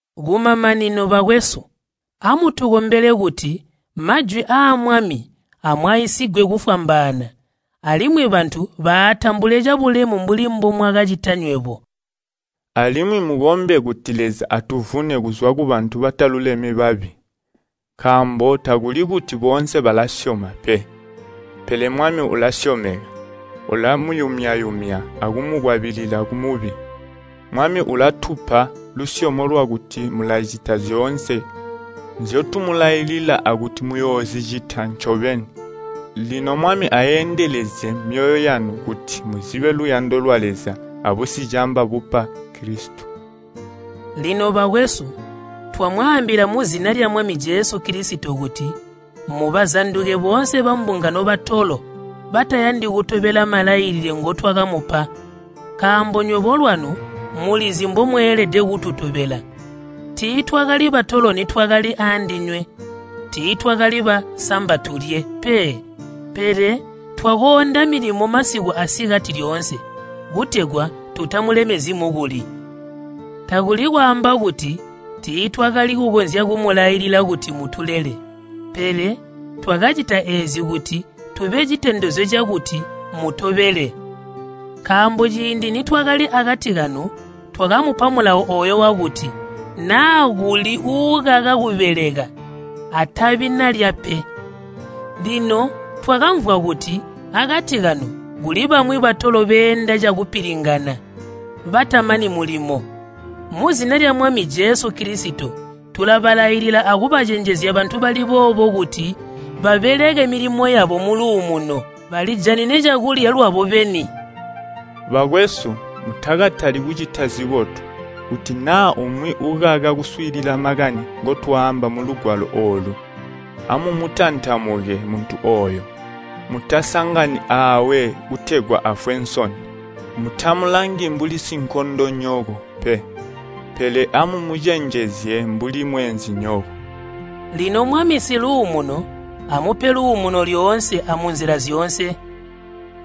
Kumamanino, bakwesu, amutukombele kuti majwi aa Mwami amwaisigwe kufwambaana alimwi bantu baatambule cabulemu mbuli mbomwakacita nywebo. Alimwi mukombe kuti Leza atuvune kuzwa kubantu bataluleme babi, nkaambo takuli kuti boonse balasyoma pe. Pele Mwami ulasyomeka, ulamuyumya-yumya akumukwabilila kumubi. Mwami ulatupa lusyomo lwakuti mulacita zyoonse nzyotumulailila akuti muyoozicita ncobeni. Lino Mwami aendelezye myoyo yanu kuti muzibe luyando lwa Leza abusicamba bupa Kilisito. Lino bakwesu, twamwaambila muzina lya Mwami Jesu Kilisito kuti mubazanduke boonse bambungano batolo batayandi kutobela malailile ngotwakamupa. Nkaambo nywebo lwanu mulizi mbomweelede kututobela. Tiitwakali batolo nitwakali aandinywe. Tiitwakali ba “samba tulye” pe, pele twakoonda milimo masiku asikati lyoonse, kutegwa tutamulemezyi mukuli. Takuli kwaamba kuti tiitwakali kukonzya kumulailila kuti mutulele, pele twakacita eezi kuti tube citondezyo cakuti mutobele. Nkaambo ciindi nitwakali akati kanu twakamupa mulawo ooyo wakuti, “Naa kuli uukaka kubeleka atabi nalya pe.” Lino twakamvwa kuti akati kanu kuli bamwi batolo beenda cakupilingana, batamani mulimo. Muzina lya Mwami Jesu Kilisito tulabalailila akubacenjezya bantu bali boobo kuti babeleke milimo yabo muluumuno, balijanine cakulya lwabo beni. Bakwesu, mutakatali kucita zibotu. Kuti naa umwi ukaka kuswiilila makani ngotwaamba mulugwalo oolu, amumutantamuke muntu ooyo, mutasangani aawe kutegwa afwe nsoni. Mutamulangi mbuli sinkondonyoko pe, pele amumucenjezye mbuli mweenzinyoko. Lino Mwami Siluumuno amupe luumuno lyoonse amunzila zyoonse.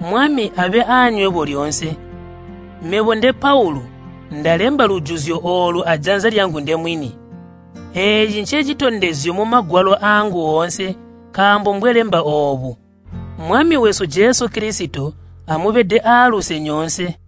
Mwami abe aanywebo lyoonse. Mebo, nde Paulu, ndalemba lujuzyo oolu ajanza lyangu ndemwini. Eeci ncecitondezyo mumagwalo aangu oonse nkaambo mbwelemba oobu. Mwami wesu Jesu Kilisito amubede aaluse nyoonse.